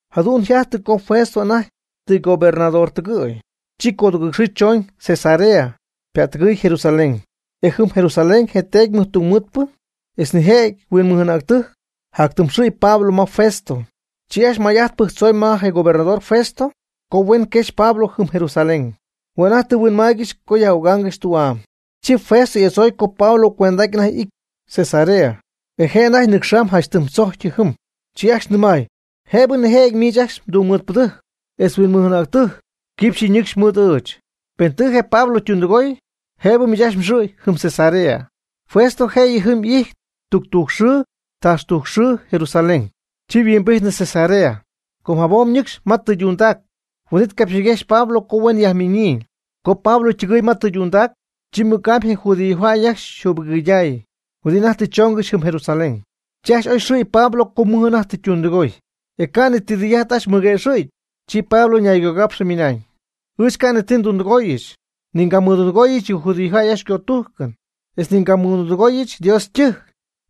Jadu'n yjajty co Festo anajty tɨ ygobernador tɨgɨ̈y, chi codugɨɨg xɨɨ choñ Cesarea, ypättɨgɨɨy Jerusalén. E jɨm Jerusalén je teedy mɨjtungmɨɨdpɨ etz nijëjɨty huinmɨj'anäctɨjc jactɨmxɨ̈y Pablo ma Festo. Chi ajcxy may'ajt pɨjctzoy ma je gobernador Festo co huen quexy Pablo jɨm Jerusalén. Hue' anajty tɨ huinmaaygɨxy co yaj'ögaangɨxy tü'am. Chi Festo y'adzooy co Pablo cuend'aty anajty y'ity Cesarea, e je' anajty nɨcxa'ñ janch tɨm tzojc jɨm. Chi ajcxy nɨmay: ―Jëbɨ nijëjɨty miich ajcxy mdungmɨɨdpɨdɨjc etz huinmɨj'anäctɨjc quipxy nɨ́cxɨbɨch mɨɨd ɨɨch. Pen tɨ je Pablo ytundɨgooy jëbɨ miich ajcxy mxɨ̈y jɨm Cesarea. Festo jëyɨ jɨm y'ijty tuctujc xɨɨ taxtujc xɨɨ Jerusalén, chi yhuimbijtnɨ Cesarea. Com jabom ñɨcxy ma tɨydundac, huin'it capxyñiguejxy Pablo co huen yajminyii. Co Pablo ytɨgɨɨy ma tɨydundac, chi mɨc'amy je judíojäy ajcxy yjübɨgɨydäy huɨdi anajty tɨ choongɨxy jɨm Jerusalén. Chi ajcxy oyxɨ̈y Pablo co mɨj anajty tɨ ytundɨgoy. E ca' ni ti tɨy'ajt ajcxy mɨguëxɨ̈gy. Chi Pablo ñaygogapxɨ ymɨnañ: ―Ɨɨch ca' ni ti ndundɨgooyɨch, ni ngamɨdundɨgooyɨch yɨ judío jäy ycötújcɨn, etz ni ngamɨdundɨgooyɨch Dios ytɨjc,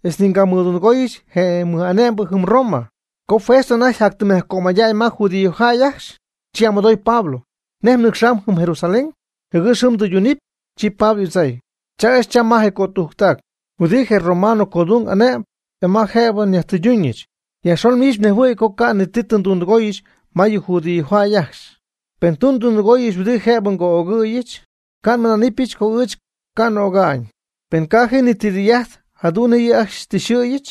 etz ni ngamɨdundɨgooyɨch je mɨj'ane'mbɨ jɨm Roma. Co Festo anajty jatytɨmyajcömaya'ñ ma judíojäy ajcxy, chi y'amɨdooy Pablo: ―¿Nej mnɨcxam jɨm Jerusalén, jɨgɨx jɨm ndɨydunɨ́pɨy? Chi Pablo y'adzooy: ―Cha ɨɨch cham ma je cötujctac huɨdi je romano codung y'ane'myb e ma jëbɨ yajtɨyduñɨch. Yajxon miich mnejhuɨ̈y co ca' ti tɨ ndundɨgooyɨch ma yɨ judíojäy ajcxy. Pen tɨ ndundɨgooyɨch huɨdi jëbɨ co'ögɨ̈yɨch, ca' nmɨná'nɨbɨch co ɨɨch ca' n'öga'ñ. Pen ca' ji ni ti tɨy'ajt jadu'n nej yɨ' ajcxy tɨ xyxɨ̈yɨch,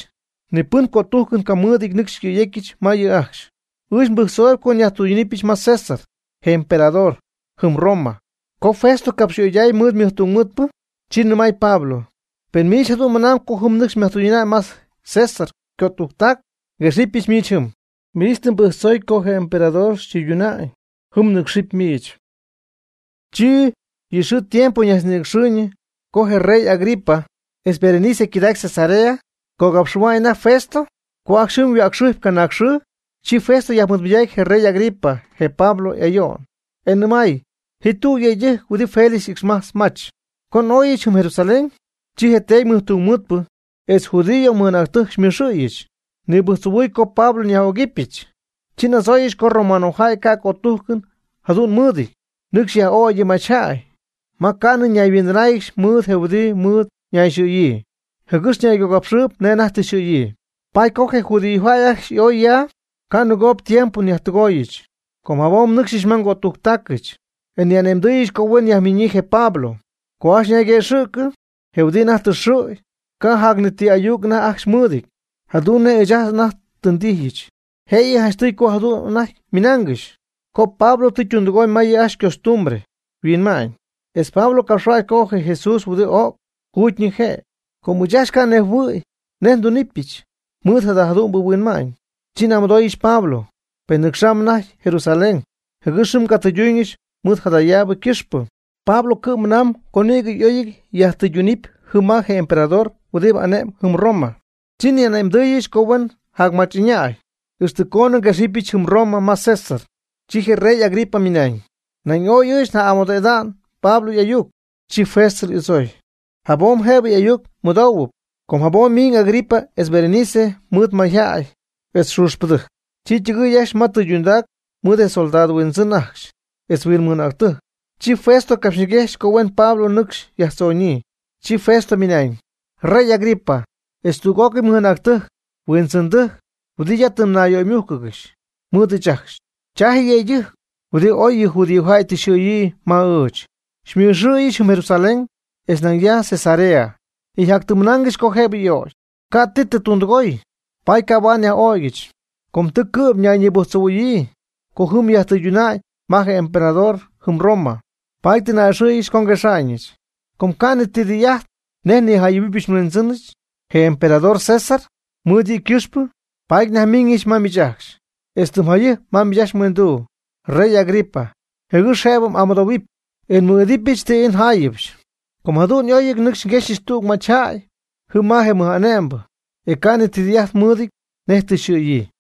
ni pɨn cötújcɨn camɨɨdɨty nɨcxy xycɨ̈yecyɨch ma yɨ' ajcxy. Ɨɨch nbɨjctzoy co nyajtɨyduñɨch ma César, je emperador, jɨm Roma. Co Festo capxyöyday mɨɨd ymɨdungmɨɨdpɨ, chi nɨmay Pablo: ―Pen miich jadu'n mɨnamb co jɨm nɨcxy myajtɨyduna'ñ ma je César ycötujctac, nguexɨpyɨch miich jɨm. Miich tɨ mbɨjctzoy co je emperador xytɨyduna'ñ. Pɨs jɨm mnɨcxɨpy miich. Chi yɨ xɨɨ tiempo ñajtznïnɨcxɨɨyñɨ co je rey Agripa etz Berenice ycɨdacy Cesarea, cogapxɨ̈hua'ñ anajty Festo. Co ajcxy jɨm yhuäcxɨjpy canaag xɨɨ, chi Festo yajmɨɨdmɨydacy je rey Agripa je Pablo ayo'n, e nɨmay: ―Ji tüg yëydɨjc huɨdi Félix y'ixmajtz mach. Co n'oyɨch jɨm Jerusalén, chi je teedy mɨjtungmɨɨdpɨ etz judío mɨj'anäctɨjc xymɨxɨ̈yɨch, nibɨjctzohuɨ̈y co Pablo nyaj'ögɨbɨch. Chi n'adzooyɨch co romanojäy ca' cötújcɨn jadu'n mɨɨdɨty nɨcxy yaj'ögy yɨ machyjäy ma ca'nɨ ñayhuindɨnáayɨgɨxy mɨɨd je huɨdi mɨɨd ñayxɨ̈yii, jɨgɨx ñaygogapxɨɨyb nej anajty tɨ yxɨ̈yii. Paady co je judíojäy ajcxy y'oy ya ca' nɨgoob tiempo nyajtɨgooyɨch com jabom nnɨcxɨch ma ngötujctaacɨch, e nni'ane'mdɨɨyɨch co huen yajmiñyii je Pablo. Co ajcxy ñayguëxɨ'cɨ, je huɨdi anajty tɨ xɨ̈y, ca' jac ni ti ayuc anajty ajcxy mɨɨdɨty jadu'n nej ɨɨch anajty tɨ ndijyɨch. Jëyɨ janchtɨy co jadu'n anajty ymɨnaangɨxy co Pablo tɨ ytundɨgooy ma yɨ' ajcxy ycostumbre huinma'ñ, etz Pablo capxhuäcxy co je Jesús huɨdi o'c, juugyñɨ je'. Com ɨɨch ca' nnejhuɨ̈y nej ndunɨpɨch mɨɨd jada jadu'mbɨ huinma'ñ, chi n'amɨdooyɨch Pablo, pen nɨcxam anajty Jerusalén, jɨgɨx jɨm ngatɨyduñɨch mɨɨd jadayaabɨ ycɨxpɨ. Pablo cɨ'm mɨnañ co nïgɨ oy yajtɨydunɨpy jɨm ma je emperador huɨdi ane'm jɨm Roma. Chi nni'ane'mdɨɨyɨch co huen jacmach'ɨñäy, ixtɨ coonɨ nguexɨpyɨch jɨm Roma ma César. Chi je rey Agripa ymɨnañ: ―Nañ ooy ɨɨch nja'amɨdo'idaanɨ Pablo y'ayuc. Chi Festo y'adzooy: ―Jabom jëbɨ ayuc mɨdohuɨpy. Com jabom miiñ Agripa etz Berenice mɨɨd mayjäy etz xuuxpɨdɨjc, chi ytɨgɨɨy ajcxy ma tɨydundac mɨɨd je soldado huindzɨn ajcxy, etz huinmɨj'anäctɨjc. Chi Festo capxyñiguejxy co huen Pablo nɨcxy yajtzonyii. Chi Festo ymɨnañ: ―Rey Agripa, etz tüg'ócɨy mɨj'anäctɨjc huindzɨndɨjc huɨdi ya tɨ mnayyöymújcɨgɨxy mɨɨd ɨɨch ajcxy, cha je' je yëydɨjc huɨdi oy yɨ judíojäy tɨ yxɨ̈yii ma ɨɨch. Xymɨxɨ̈yɨch jɨm Jerusalén, e nañ ya Cesarea, e jatyɨmymɨnaangɨxy co jëbɨ y'ögy. Ca' ti tɨ tundɨgooy, paady ca' huaad nyaj'ögyɨch. Com tɨ cɨ'm ñayñibɨjctzohuɨ̈yii co jɨm yajtɨyduna'ñ ma je emperador jɨm Roma, paady tɨ n'a'ɨxɨ̈yɨch co nguexaañɨch. E com ca' ni ti tɨy'ajt nej nijayɨ̈huɨbɨch nhuindzɨnɨch, je emperador César, mɨɨd yɨ' ycɨxpɨ, paady nyajmiiñɨch ma miich ajcxy, etz tɨm jayɨjp ma miich mhuinduu, rey Agripa, jɨgɨx jëbɨ m'amɨdohuɨpy e nmɨɨd'idɨpyɨch ti ii njáayɨbɨch. Ca' jadu'n y'óyɨty nɨcxy nguexyɨch tüg machyjäy jɨm ma je mɨj'ane'mbɨ e ca' ni ti tɨy'ajt mɨɨdɨty nej tɨ yxɨ̈yii.